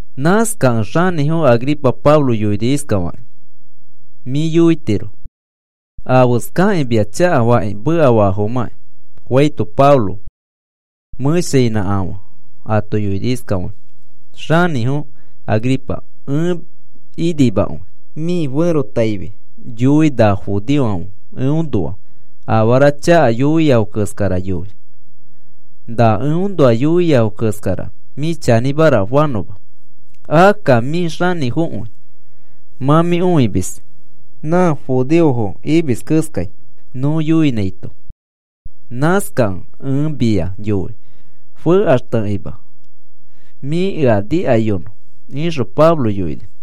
Nãskakẽ xanĩfo Agripa Pablo yoini iskafakĩ: “Mĩ yoitiro afeskakĩ mia chakafakĩ mekafafomãkĩ,” faito Pablo mẽshainãkafã ato yoini iskafakĩ: “Xanĩfo Agripa, ẽ inimakõi mĩ ferotaifi yoi na judeofãfe eõnoa afara chaka yoiafo keskara yoi, na eõnoa yoiafo keskara mĩ chanĩmara fanõma. Akka mĩ xanĩfokõi mã mĩ õimis, nã judeofo imis keskai nõ yoinãito. Nãskakẽ ẽ mia yoi, fekaxtekima mĩ ea nikayonõ,” ixõ Pablo yoini.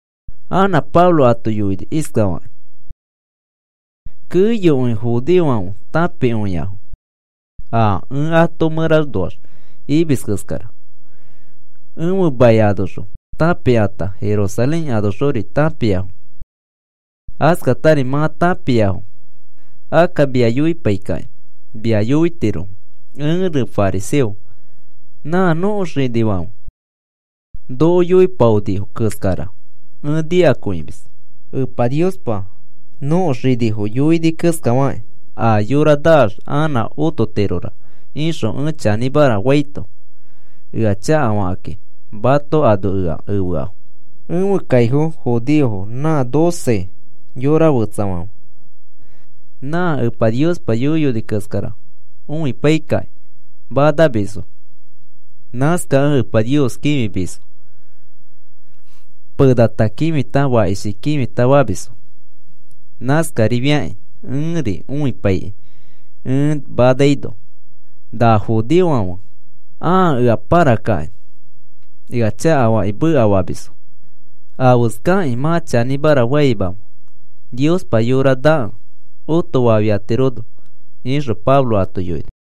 Anã Pablo ato yoini iskafakĩ: “Keyokõi judeofãfe tãpikõiafo a ẽ ato mẽranoax imis keskara, ẽfe mai anoxõ tãpikãta, Jerusalén anoxori tãpiafo. Askatari mã tãpiafo, akka mia yoipaikakĩ mia yoitirofo, ẽri fariseo. Nã nõko xinifãfe noko yoipaonifo keskara ẽ nikakõimis. Epa Niospa nõko xinifo yoini keskafakĩ, a yora naax anã ototirora ixõ ẽ chanĩmara faito, ea chakafakakĩ mato ano ea efeafo. Ẽfe kaifo judeofãfe nã doce xoko fetsafãfe, nã Epa Niospa yoiyoni keskara õipaikakĩ manamisfo. Nãskakẽ Epa Nios kĩfimisfo, penata kĩfita fakishi kĩfikĩ famisfo. Nãskarifiakĩ ẽri õipaikĩ ẽ manaino, na judeofãfe ãa ea pãrakakĩ ea chakafakĩ mekafamisfo. ¿Afeskakĩ mã chanĩmara faimamẽ, Niospa yora nakẽ otofafiatirono?” ixõ Pablo ato yoini.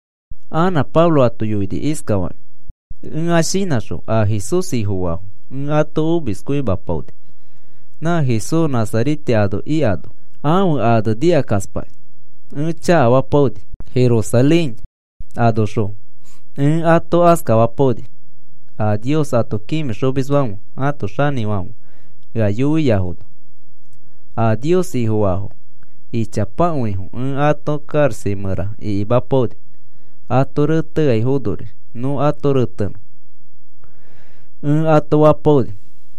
Anã Pablo ato yoini iskafakĩ: “Ẽa shinãxõ a Jesús Ifofaafo ẽ ato omiskõimapaoni. Nã Jesús Nazarete ano ikano, ãfe ane nikakaspakĩ ẽ chakafapaoni. Jerusalén anoxõ ẽ ato askafapaoni. A Nios ato kĩfixomisfãfe ãto xanĩfofofãfe ea yoiafono a Nios Ifofaafo ichapakõifo ẽ ato karaxa mẽra ikimapaoni. Ato reteaifonori nõ ato retenõ ẽ ato fapaoni.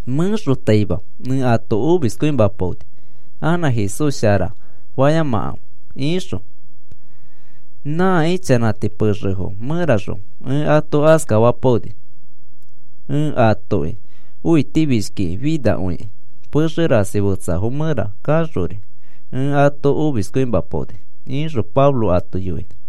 Mẽxotaima ẽ ato omiskõimapaoni, anã Jesús sharara fayamakãfe ixõ. Nã ichanãti pexefo mẽraxõ ẽ ato askafapaoni. Ẽ atoki õitifishkikĩ finakõikĩ pexe rasi fetsafo mẽra kaxori ẽ ato omiskõimapaoni,” ixõ Pablo ato yoini.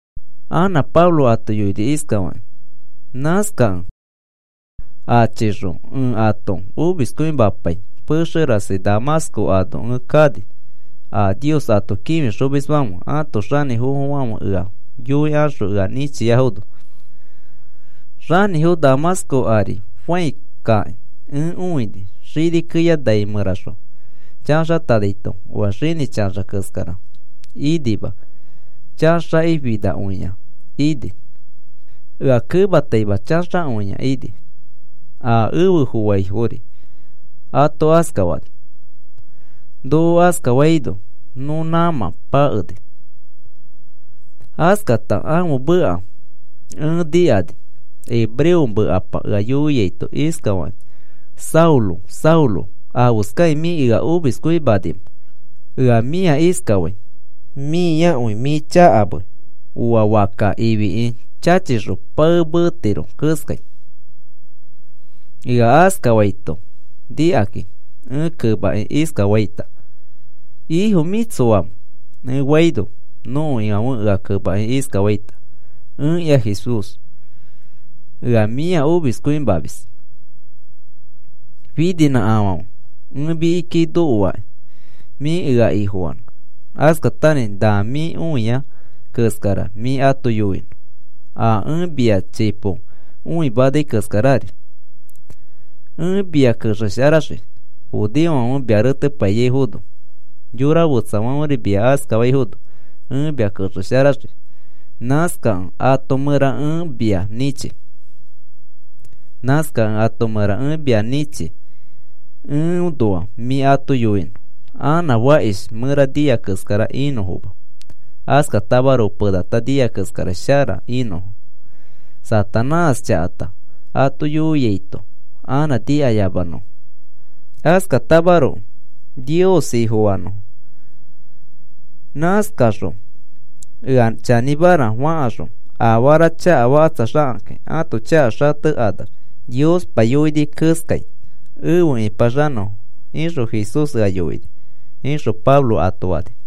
Anã Pablo ato yoini iskafakĩ: “Nãskakẽ achixõ ẽ ato omiskõimapai pexe rasi Damasco ano ẽ kani, a Nios ato kĩfixomisfãfe ãto xanĩfofofãfe ea yoikaxõ ea nĩchiafono. Xanĩfo Damasco ari fãi kakĩ ẽ õini xini keya nai mẽraxõ chaxatanaito oa xinĩ chaxa keskara inima, chaxakĩ finakõini. Ea kemataima chaxakõia ini, a efe fofaifori ato askafani. Noko askafaino nõ nãmã pakeni. Askata ãfe meka ẽ nikani hebreo mekapa ea yoiaito iskafakĩ: ‘Saulo, Saulo, ¿afeskakĩ mĩ ea omiskõimanimẽ? Ea mĩa iskafai, mĩakõi mĩ chakamei oa fakka ifiki chachixõ pae meetiro keskai.’ “Ea askafaito nikakĩ ẽ kemakĩ iskafaita: ‘¿Ifo, mĩ tsoamẽ?’ ẽ faito, nõko Ifãfe ea kemakĩ iskafaita: ‘Ẽkĩa Jesús, ea mĩa omiskõimamis. Fininãkafãfe ẽ mikiki nokoaki mĩ ea Ifofanõ. Askatari na mĩ õiai keskara mĩ ato yoinõ, a ẽ mia chipo õimanai keskarari. Ẽ mia kexesharaxii judeofãfe mia retepaiyaifono, yora fetsafãferi mia askafaifono ẽ mia kexesharaxii. Nãskakẽ ato mẽra ẽ mia nĩchi. Nãskakẽ ato mẽra ẽ mia nĩchi, eõnoa mĩ ato yoinõ anã fakish mẽra nia keskara inõfoma, askatamaroko penata nia keskara shara inõfo, Satanás chakata ato yoiaito anã nikayamanõfo, askatamaroko Nios Ifofanõfo. Nãskakaxõ ea chanĩmara fakaxõ afara chakafakatsaxakakĩ ãto chaka xatekanax Niospa yoini keskai efe ĩpaxanõfo,’ ixõ Jesús ea yoini,” ixõ Pablo ato fani.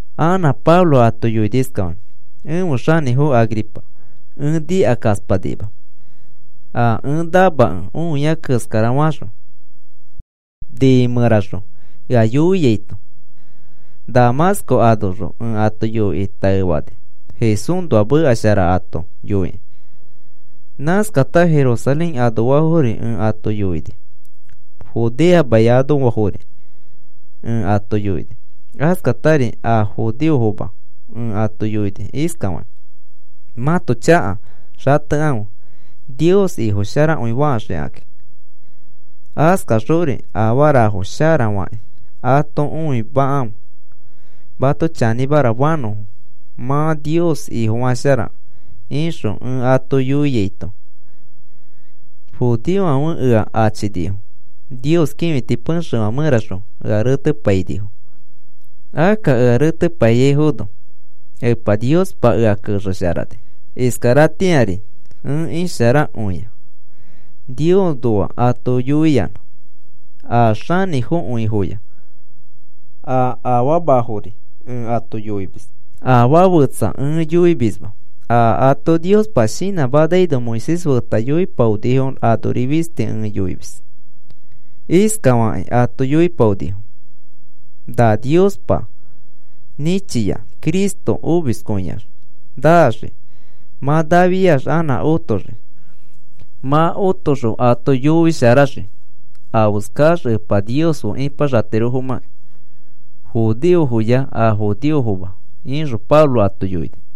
Anã Pablo ato yoini iskafakĩ: “Ẽfe xanĩfo Agripa, ẽ nikakaspanima a ẽ namakẽ õia keskarafaxõ nĩi mẽraxõ ea yoiaito. Damasco anoxõ ẽ ato yoikĩ taefani Jesúsnoa meka shara ato yoikĩ. Nãskata Jerusalén anoafori ẽ ato yoini, Judea mai anoafori ẽ ato yoini. Askatari a judeofoma ẽ ato yoini iskafakĩ: ‘Mãto chaka xatekãfe Nios Ifosharakõifaxikakĩ, askaxori afarafo shara fakĩ ato õimakãfe mato chanĩmara fanõfo mã Nios Ifofasharakẽ,’ ixõ ẽ ato yoiaito, judeofãfe ea achinifo Nios kĩfiti pexefã mẽraxõ ea retepainifo. Akka ea retepaiyaifono Epa Niospa ea kexesharani, iskaratĩari ẽ isharakõia Niosnoa ato yoiyanã. A xanĩfokõifoya a afamafori ẽ ato yoimis. Afaa fetsa ẽ yoimisma. A ato Niospa shinãmanaino Moisés feta yoipaonifo anori fisti ẽ yoimis. Iskafakĩ ato yoipaonifo, na Niospa nĩchia Cristo omiskõiax naxii. Mã nafiax anã otoxii, mã otoxõ ato yoisharax afeskax Epa Nios fe ipaxatirofomãkĩ, judeofoya a judeofoma,” ixõ Pablo ato yoini.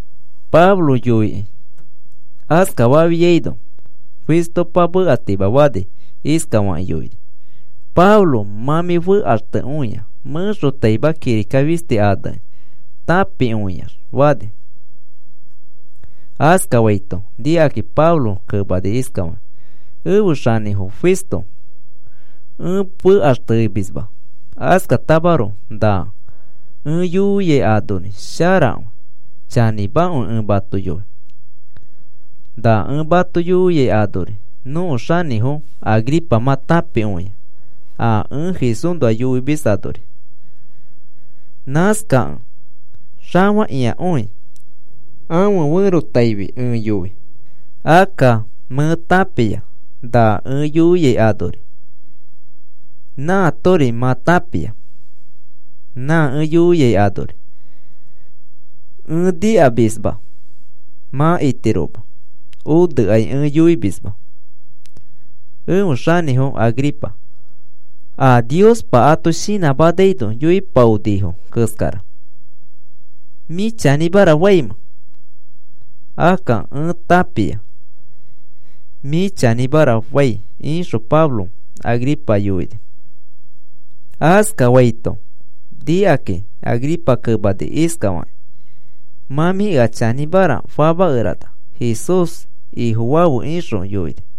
Pablo yoikĩ askafafiaino, Festopa mekatimafani iskafakĩ yoini: “Pablo, mã mĩ fekaxtekõia mẽxotaima kirika fisti anekĩ tãpikõiax,” fani. Askafaito nikakĩ Pablo kemani iskafakĩ: “Ẽfe xanĩfo Festo, ẽ fekaxtemisma. Askatamaroko na ẽ yoiai anori sharakõi, chanĩmakõi ẽ mato yoi. Na ẽ mato yoiai anori nõko xanĩfo Agripa mã tãpikõia a ẽ Jesúsnoa yoimis anori. Nãskakẽ xafakĩakõi ãfe ferotaifi ẽ yoi, akka mẽ tãpia na ẽ yoiai anori nãatori mã tãpia. Nã ẽ yoiai anori ẽ nikamisma mã itiroma onekai ẽ yoimisma. Ẽfe xanĩfo Agripa, a Niospa ato shinãmanaino yoipaonifo keskara, ¿mĩ chanĩmara faimẽ? Akka ẽ tãpia mĩ chanĩmara fai,” ixõ Pablo Agripa yoini. Askafaito nikaki Agripa kemani iskafakĩ: “Mã mĩ ea chanĩmara famakerana Jesús Ifofafe,” ixõ yoini.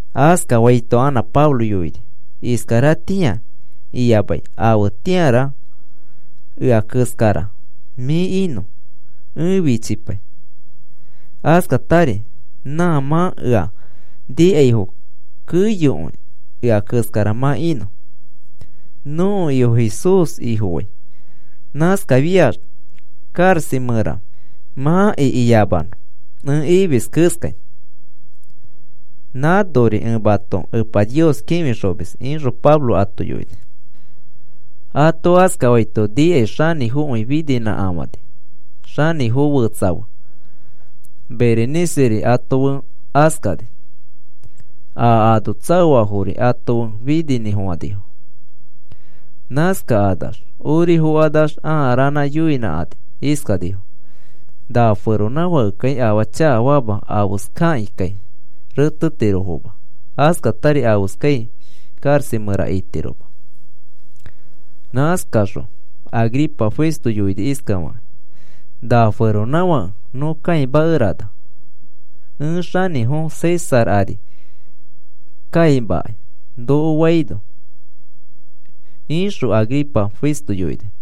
Askafaito anã Pablo yoini: “Iskaratĩa iyamai afetĩara ea keskara mĩ inõ ẽ fichipai, askatari nã mã ea nikaifo keyokõi ea keskara mã inõ. Nõko Ifo Jesús Ifofai nãskafiax karaxa mẽra mã ikiyamanõ ẽ imis keskai. Nãnori ẽ mato Epa Nios kĩfixomis,” ixõ Pablo ato yoini. Ato askafaito nikai xanĩfokõi fininãkafani, xanĩfo fetsa fe, Bereniceri ato fe askani, a ano tsaoafori ato fe fininĩfofãnifo. Nãskakanax ori fokanax ãa ranã yoinãkani iskanifo: “Na feronãfãkekai afaa chakafama afeskakĩkai retetirofoma, askatari afeskai karaxa mẽra itiroma.” Nãskaxõ Agripa Festo yoini iskafakĩ: “Na feronãfake nõ kãimakerana, ẽ xanĩfo César ari kaimakai noko faino,” ixõ Agripa Festo yoini.